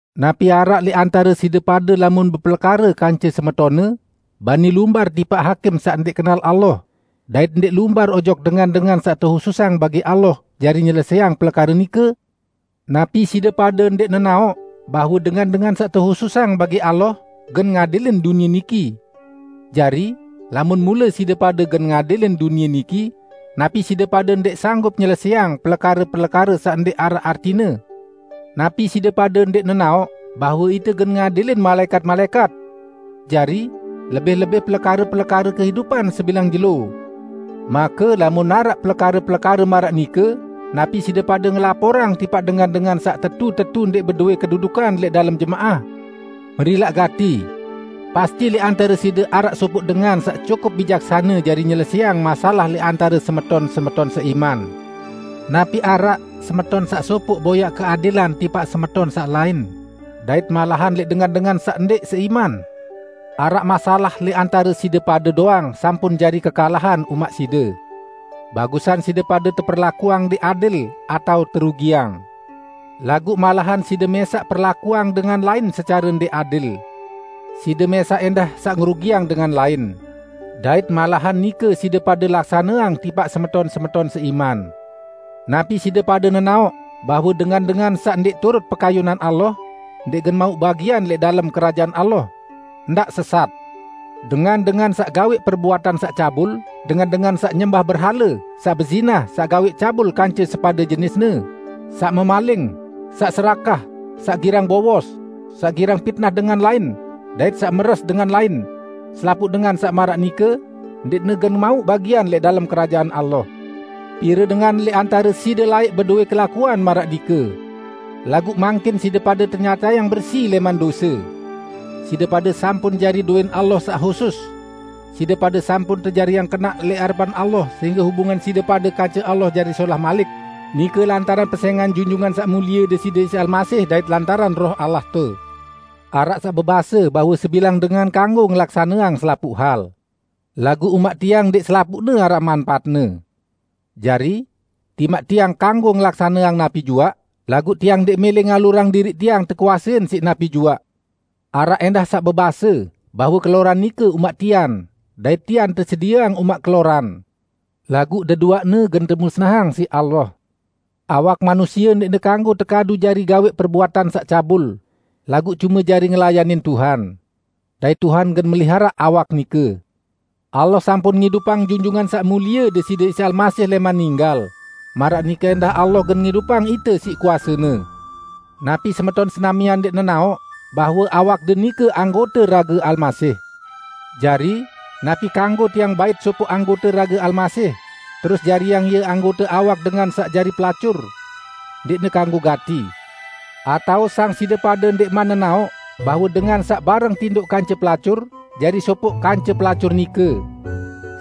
Napi araq lẽq antare side pade lamun bepelekare kance semetonne, bani lumbar tipaq hakim saq ndẽq kenal Allah, dait ndẽq lumbar ojok dengan-dengan saq tehususang bagi Allah jari nyelesẽang pelekare nike? Napi side pade ndẽq nenaoq bahwe dengan-dengan saq tehususang bagi Allah gen ngadilin dunie niki? Jari, lamun mule side pade gen ngadilin dunie niki, napi side pade ndẽq sanggup nyelesẽang pelekare-pelekare saq ndẽq araq artine? Napi side pade ndẽq nenaoq bahwe ite gen ngadilin malaẽkat-malaẽkat? Jari, lebih-lebih pelekare-pelekare kehidupan sebilang jelo? Make, lamun araq pelekare-pelekare maraq nike, napi side pade ngelaporang tipaq dengan-dengan saq tetu-tetu ndẽq bedowẽ kedudukan lẽq dalem jemaah? Merilaq gati! Pasti lẽq antare side araq sopoq dengan saq cukup bijaksane jari nyelesẽang masalah lẽq antare semeton-semeton seiman! Napi araq semeton saq sopoq boyaq keadilan tipaq semeton saq lain, dait malahan lẽq dengan-dengan saq ndẽq seiman? Araq masalah lẽq antare side pade doang sampun jari kekalahan umaq side. Bagusan side pade teperlakuang ndẽq adil, atao terugiang! Laguq malahan side mẽsaq perlakuang dengan lain secare ndẽq adil. Side mẽsaq ẽndah saq ngerugiang dengan lain. Dait malahan nike side pade laksaneang tipaq semeton-semeton seiman! Napi side pade nenaoq bahwe dengan-dengan saq ndẽq turut pekayunan Allah, ndẽq gen mauq bagian lẽq dalem Kerajaan Allah? Ndaq sesat! Dengan-dengan saq gawẽq perbuatan saq cabul, dengan-dengan saq nyembah berhale, saq bezinah, saq gawẽq cabul kance sepade jenisne, saq memaling, saq serakah, saq girang bowos, saq girang pitnah dengan lain, dait saq meres dengan lain -- selapuq dengan saq maraq nike, ndẽqne gen mauq bagian lẽq dalem Kerajaan Allah. Pire dengan lẽq antare side laẽq bedowẽ kelakuan maraq nike. Laguq mangkin side pade tenyatayang bersi lẽman dose. Side pade sampun jari dowẽn Allah saq husus. Side pade sampun tejariang kenaq lẽq arepan Allah sehingge hubungan side pade kance Allah jari solah malik, nike lantaran pesẽngan Junjungan Saq Mulie Deside Isa Almasih dait lantaran Roh Allahte. Araq saq bebase bahwe sebilang dengan kanggo ngelaksaneang selapuq hal. Laguq umaq tiang ndẽq selapuqne araq manpaatne. Jari, timaq tiang kanggo ngelaksaneang napi juaq, laguq tiang ndẽq mẽlẽ ngalurang diriq tiang tekuasein siq napi juaq. Araq ẽndah saq bebase bahwe keloran nike umaq tian, dait tian tesedieang umaq keloran. Laguq deduaqne gen temusnahang siq Allah. Awak manusie ndẽqne kanggo tekadu jari gawẽq perbuatan saq cabul, laguq cume jari ngelayanin Tuhan. Dait Tuhan gen meliharaq awak nike. Allah sampun ngidupang Junjungan Saq Mulie Deside Isa Almasih lẽman ninggal, maraq nike ẽndah Allah gen ngidupang ite siq kuase-Ne. Napi semeton senamian ndẽq nenaoq bahwe awakde nike anggote rage Almasih. Jari, napi kanggo tiang bait sopoq anggote rage Almasih, terus jariang ie anggote awak dengan saq jari pelacur? Ndẽqne kanggo gati! Atao sang side pade ndẽqman nenaoq bahwe dengan saq bareng tindoq kance pelacur, jari sopoq kance pelacur nike!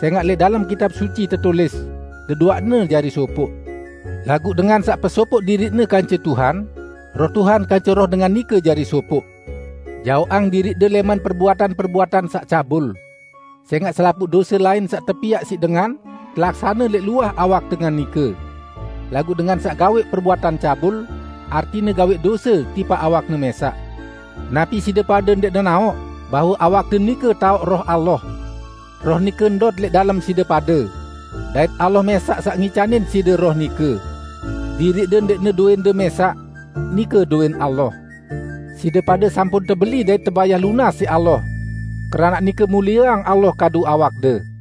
Sẽngaq lẽq dalem Kitab Suci tetulis, "Deduaqne jari sopoq." Laguq dengan saq pesopoq diriqne kance Tuhan, Roh Tuhan kance roh dengan nike jari sopoq. Jaoqang diriqde lẽman perbuatan-perbuatan saq cabul. Sẽngaq selapuq dose lain saq tepiaq siq dengan, telaksane lẽq luah awak dengan nike. Laguq dengan saq gawẽq perbuatan cabul, artine gawẽq dose tipaq awakne mẽsaq. Napi side pade ndẽq nenaoq bahwe awakde nike taoq Roh Allah. Roh nike ndot lẽq dalem side pade. Dait Allah mẽsaq saq ngicanin side Roh nike. Diriqde ndẽqne dowẽnde mẽsaq. Nike dowẽn Allah. Side pade sampun tebeli dait tebayah lunas siq Allah. Keranaq nike, mulieang Allah kadu awakde.